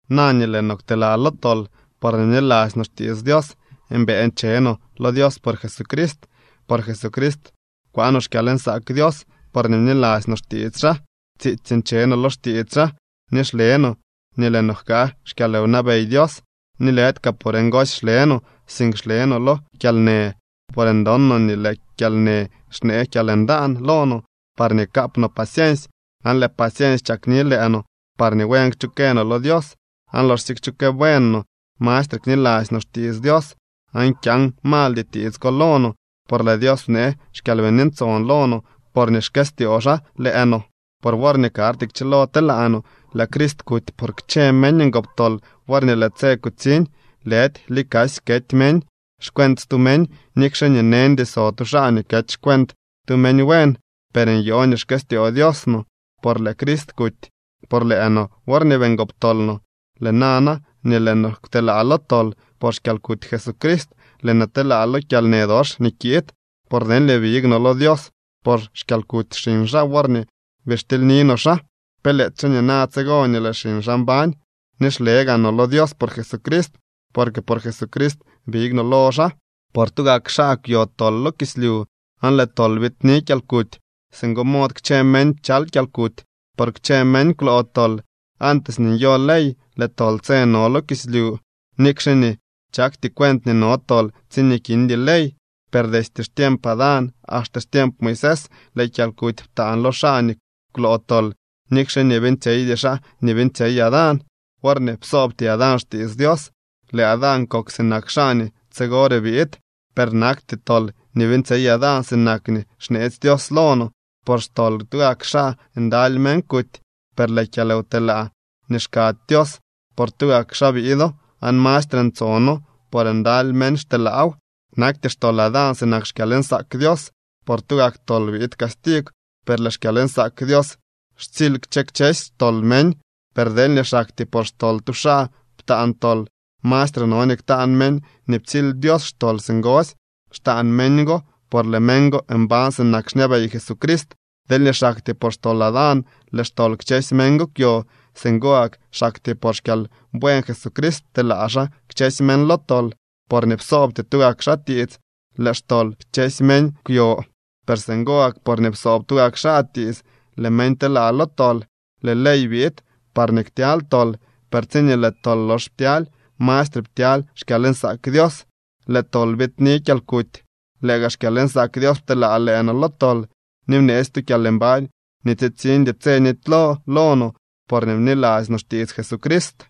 Na nii lëë no kwtelaa lo tol porñee bniladzy no xtiits Dios, mbëë nche no lo Dios por Jesucrist. Por Jesucrist kwaa no xkyalnsaak Dios porñee bniladzy no xtiits xaa. Tsiitsy nche no lo xtiits xaa ni xle no nii lëë no jkaa xkyalwnabey Dios. Ni lëdy kaa por ngosy xle no, sink xle no lo kyalnë, por ndon no nii lëë kyalnë xnee kyalndaan lo no parñee kaap no paciensy. Aan lëë paciensy chakni lëë no parñee buen kchukë no lo Dios, aan loxsye kchukë buen no, mastre kniladzy no xtiits Dios. Aan kyaan maldy tiits ko lo no, por lëë Dios bnee xKyalbini Ntson lo no porñee xkëstyoo xaa lëë no. Por worñee karty kchilo telaa no, lëë Crist kuty por kchë meñ ngoptol worñee lëë tse kutsiñ. Lëdy likasy kety meñ xcuent stu meñ, nikxe nii neñdy so tu xaa nii kety xcuent tu meñ buen. Per nyoo nii xkëstyoo Dios no, por lëë Crist kuty por lëë no worñee bii ngoptol no. Lëë nana nii lëë no kwtelaa lo tol por xkyalkuty Jesucrist, lëë no telaa lo kyalnë dox nii kiid. Por deelñee big no lo Dios por xkyalkuty xiñ xaa worñee bii xtilyni no xaa, pe lëëdyxe nina tsigo nii lëë xiñ xaa mbañ. Ni xle gaa no lo Dios por Jesucrist, porque por Jesucrist big no lo xaa. Por tugak xaa kwyo tol lo kislyu aan lëë tol biidni kyalkuty. Singo mod kchë meñ pchal kyalkuty, por kchë meñ kwloo tol. Antes nii nyo ley, lëë tol tse no lo kislyu, nikxe nii chakty cuent nii no tol tsiñee kindy ley. Per destye xtiemp Adán axte xtiemp Moisés lëë kyalkuty ptaan lo xaa nii kwloo tol, nikxe nii beeñtsyeydy xaa si beeñtsyey Adán worñee psoobty Adán xtiits Dios. Lëë Adán kok sinak xaa nii tsigore biid. Per nakty tol nii beeñtsyey Adán sinak nii xneetsy Dios lo no. Por xtol tugak xaa ndaly meñ kuty. Per lëë kyalwtelaa nii xkady Dios, por tugak xaa biido, aan mastre ntsono, por ndaly meñ xteelaaw. Nakty xtol Adán sinak xkyalnsaak Dios. Por tugak tol biid castigw, per lëë xkyalnsaak Dios xtsily kchë kchësy xtol meñ. Per deelñee xaktyee por xtol tu xaa ptaan tol, mastre no nii ktaan meñ nii ptsily Dios xtol singosy. Xtaan meñ go, por lëë meñ go mbañ sinak xñabey Jesucrist. Deelñee xaktyee por xtol Adán lëë xtol kchësy meñ kwyo, singo gak xaktyee por xkyalbuen Jesucrist pteelaa xaa kchësy meñ lo tol. Porñee psoobty tugak xaa tiits, lëë xtol kchësy meñ kwyo, per singo gak porñee psoob tugak xaa tiits, lëë meñ telaa lo tol. Lëë ley biid parñee ktyaly tol, per tsiñee lëë tol lox ptyaly, mastre ptyaly xkyalnsaak Dios. Lëë tol biidni kyalkuty. Lëë gaa xkyalnsaak Dios pteelaa lëë no lo tol ni bneetsy tu kyalmbañ nii tsitsiñdy tse nitylo lo no porñee bniladzy no xtiits Jesucrist.